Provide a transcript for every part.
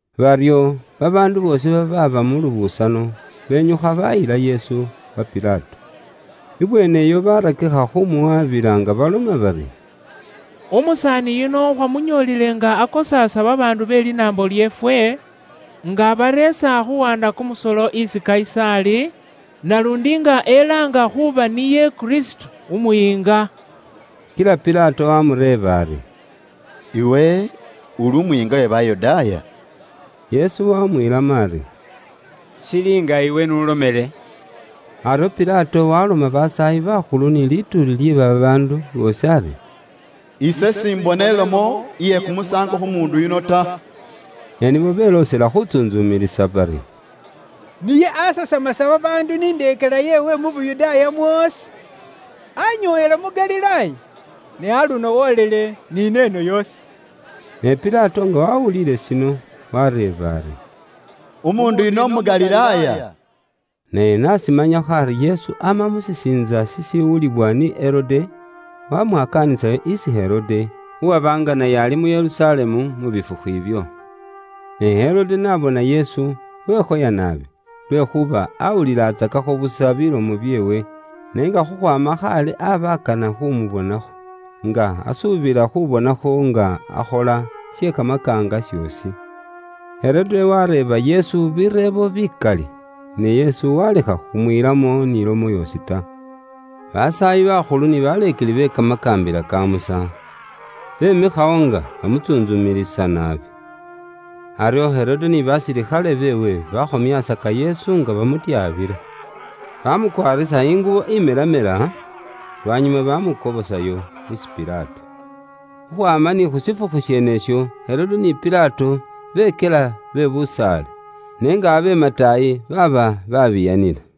Baryo, babaandu boosi babaaba mu lubusano, benyukha bayila Yesu wa Pilato. Ibweene iyo barakikha khumuwabila nga baloma bari, “Umusaani yuno khwamunyoolele nga akosaasa babaandu be linaambo lyeefwe, nga abareesa khuuwanda kumusolo isi Kayisaali, naluundi nga elaanga khuuba niye Kristo Umuyiinga.” Kila Pilato waamureeba ari, “Iwe uli Umuyiinga we Bayudaaya?” Yesu wamwiilamo ari, “Shili nga iwe n'ulomele.” Aryo Pilato waloma basaayi bakhulu ni lituuli lye babaandu boosi ari, “Ise simbona ilomo iye kumusaango khu muundu yuno ta.” Ne nibo beloosela khutsuntsumilisa bari, “Niye asasamasa babaandu ni indeekela yeewe mu Yuda mwoosi. Anyoowela mu Galilaaya, ni aluno woolile ni neeno yoosi.” Ne Pilato nga wawuliile shino, wareeba ari, “Umuundu yuno umu Galilaaya?” Naye n'ashimanyakho ari Yesu ama mu shisiintsa shishiwuliwa ni Herode, wamwakaanisayo isi Herode, uwaba nga naye ali mu Yerusalemu mu bifukhu ibyo. Ne Herode n'abona Yesu, wekhoya naabi, lwekhuuba awulilatsakakho busa bilomo byeewe, ne nga khukhwaama khaale aba akana khu mubonakho, nga asuubila khubonakho nga akhola she kamakaanga shoosi. Herode wareeba Yesu bireebo bikali, ne Yesu walekha khumwiilamo ni lomo yoosi ta. Basaayi bakhulu ni baleekeli be kamakaambila ka Musa, bemikhawo nga bamutsuntsumilisa naabi. Aryo Herode ni basilikhale beewe, bakhomyaasaka Yesu nga bamutyabila. Bamukwaarisa ingubo imelamela, lwanyuma bamukobosayo isi Pilato. Khukhwaama ni khu shifukhu sheenesho, Herode ni Pilato bekyela be busaale, ne nga abe mataayi baaba babiiyanila.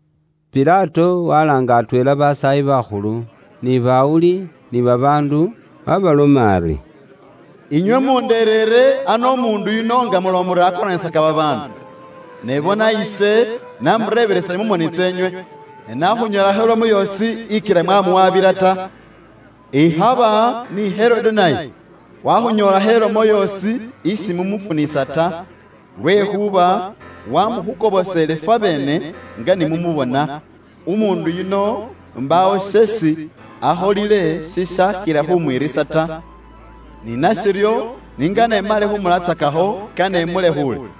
Pilato walaanga atweela basaayi bakhulu, ni bawuli ni babaandu, waabaloma ari, “Inywe mundereere ano umuundu yuno nga muloma muri akoraanisaka babaandu. Ne bona ise namureebelesile mu moni tseenywe, ne nakhunyoolakho ilomo yoosi ikila mwamuwabila ta. Ikhaba ni Herode naye wakhunyoolakho ilomo yoosi isi mumufunisa ta, lwekhuuba wamukhukoboseele fwabeene nga ni mumubona. Umuundu yuno mbaawo sheesi akholile shishaakhila khumwiirisa ta. Ni nashiryo, ni ngane imale khumulatsakakho, kane imulekhuule.”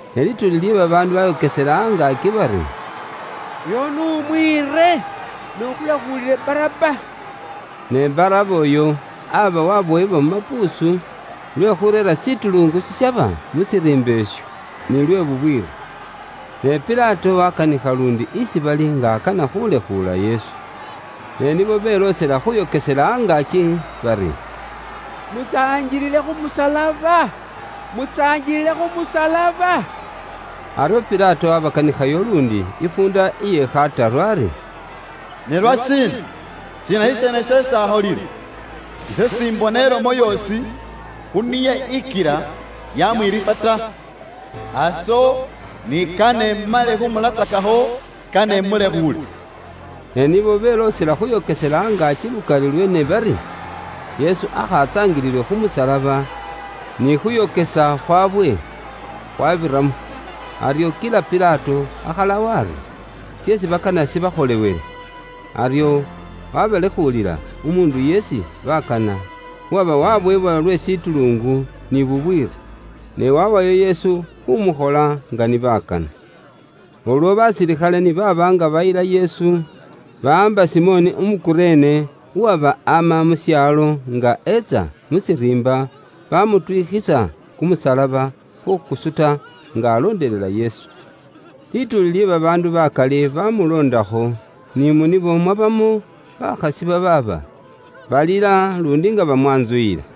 Ne lituuli lye babaandu bayokesela angaaki bari, “Uyo n'umwiire, ne ifwe ukhulekhuulile Baraba.” (Ne Baraba uyo aba wabowebwa mu mapuusu lwe khureera shishitulungu shishaba mu shiriimba isho, nilwe bubwiiri.) Ne Pilato wakanikha luundi isi bali nga akana khulekhuula Yesu. Ne nibo beloosela khuyokesela angaaki bari, “Mutsaangilile khu musalaba, mutsaangilile khu musalaba.” Aryo Pilato waabakanikhayo luundi ifuunda iye khataru ari, “Ne lwashiina? Shiina shisheene sheesi akholile? Ise simbona ilomo yoosi khu niye ikila yamwiirisa ta. Aso ni kane imale khumulatsakakho, kane imulekhuule.” Ne nibo beloosela khuyokesela angaaki lukali lweene bari, Yesu aakha atsaangililwe khu musalaba, ni khuuyokesa khwaabwe khwaabiramo. Aryo kila Pilato akhalawo ari, sheesi bakana shibakholewele. Aryo waabalekhuulila umuundu isi baakana, uwaba waabowebwa lwe shishitulungu ni bubwiiri. Ne waawayo Yesu khuumukhola nga ni bakana. Ulwo basilikhale ni baaba nga bayila Yesu, bawaamba Simoni Umu Kurene, uwaba ama mu shaalo nga etsa mu shiriimba, bamutwikhisa kumusalaba khukusuta nga alondelela Yesu. Lituuli lye babaandu bakali bamuloondakho, ni mu nibo mwabamo bakhasi babaaba balila luundi nga bamwantsuyila.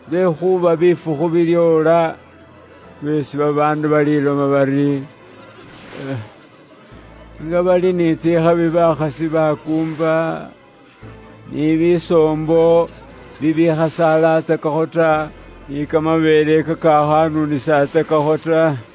Lwekhuuba bifukhu bilyoola lweesi babaandu baliloma bari, ‘Nga bali ni tsikhabi bakhasi bakuumba, ni bisoombo bibikhasaalatsakakho ta, ni kamabeele kakakhanunisatsakakho ta.’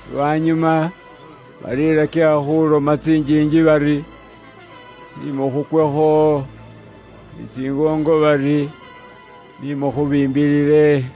Lwanyuma balilakikha khuloma tsinjiinji bari, ‘Ni mukhukwekho,’ ni tsingoongo bari, ‘Ni mukhubiimbilile.’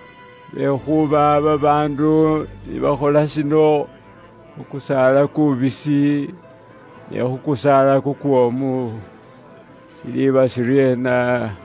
Lwekhuuba babaandu ni bakhola shino khu kusaala kubisi, ne khu kusaala kukwoomu, shiliiba shiryeena?”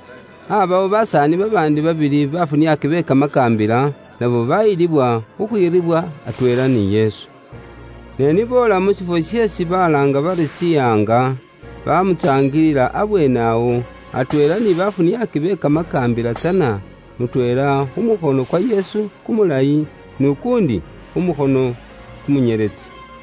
Aabawo basaani babaandi babili, bafuniaaki be kamakaambila, nabo bayilibwa khukhwiiribwila atweela ni Yesu. Ne ni boola mu shifwo sheesi balaanga bari “Shihaanga,” baamutsaangilila abweene awo, atweela ni baafuniaaki be kamakaambila tsana, mutweela khu mukhono kwa Yesu kumulayi, n'ukuundi khu mukhono kumunyeletsi.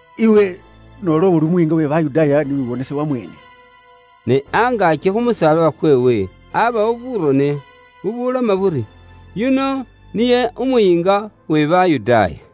“Iwe noola uli Umuyiinga we Bayudaaya, ni wiwonese wamweene.” Ne angaaki khu musalaba kweewe abaawo burone bubuloma buri, “YUNO NIYE UMUYIINGA WE BAYUDAAYA.”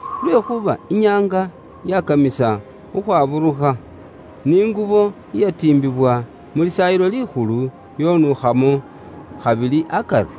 lwekhuuba inyaanga yakamisa khukhwaburukha. Ni ingubo iyatiimbibwa mu Lisaayilo Likhulu yonuukhamo khabili akari.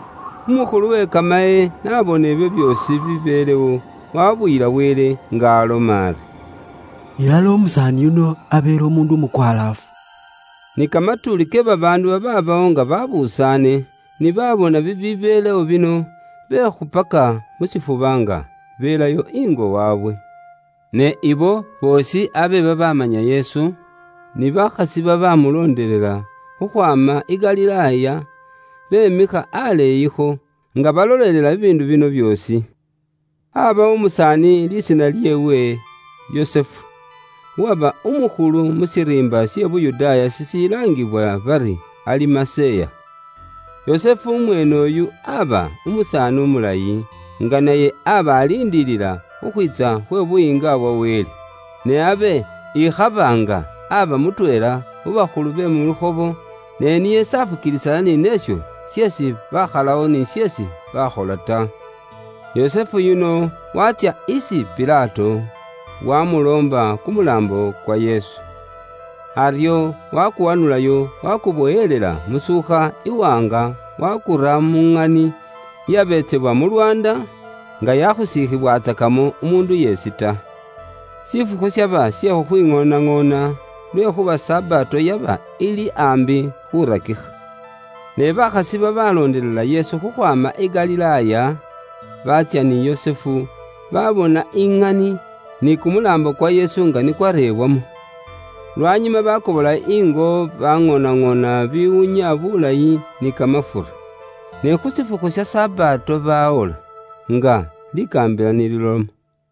Umukhulu we kamaye n'abona ibyo byoosi bibibeelewo, waabuyila Wele nga aloma ari, “Ilala umusaani yuno abeele umuundu umukwalaafu.” Ni kamatuuli ke babaandu babaabawo nga baabusaane, ni baabona bibibeelewo bino, bekhupaka mu shifuba nga beelayo ingo waabwe. Ne abo boosi abe babaamanya Yesu, ni bakhasi babaamuloondelela khukhwaama i Galilaaya, beemikha aleeyikho, nga balolelela bibiindu bino byoosi. Aabawo umusaani lisiina lyeewe Yusufu, uwaba umukhulu mu shiriimba she Yuda shishilaangibwa bari Alimaseya. Abe ali umusaani umulayi, nga naye abe aliindilila khukhwiitsa khwe Buyiinga bwa Wele. Ne abe ikhaba nga aba mutweela khu bakhulu be mu lukhobo, ne niye s'afukiilisana ni neesho sheesi baakhalawo ni sheesi baakhola ta. Yusufu yuno waatsya isi Pilato, wamuloomba kumulaambo kwa Yesu. Aryo wakuwanulayo, wakubowelela musuukha iwaanga, wakura mu ŋani iyabeetsebwa mu lwaanda, nga yakhusiikhiwatsakamo umuundu yeesi ta. Shifukhu shaba she khukhwiŋoonaŋoona, lwekhuuba Sabato yaba ili aambi khurakikha. Ne bakhasi babaloondelela Yesu khukhwaama i Galilaaya, baatsya ni Yusufu, babona iŋani, ni kumulaambo kwa Yesu nga ni kwareebwamo. Lwanyuma bakobolayo ingo, baŋoonaŋoona bibiwunya bulayi ni kamafura. Ne khu shifukhu sha Sabato bawola, nga likaambila ni liloma.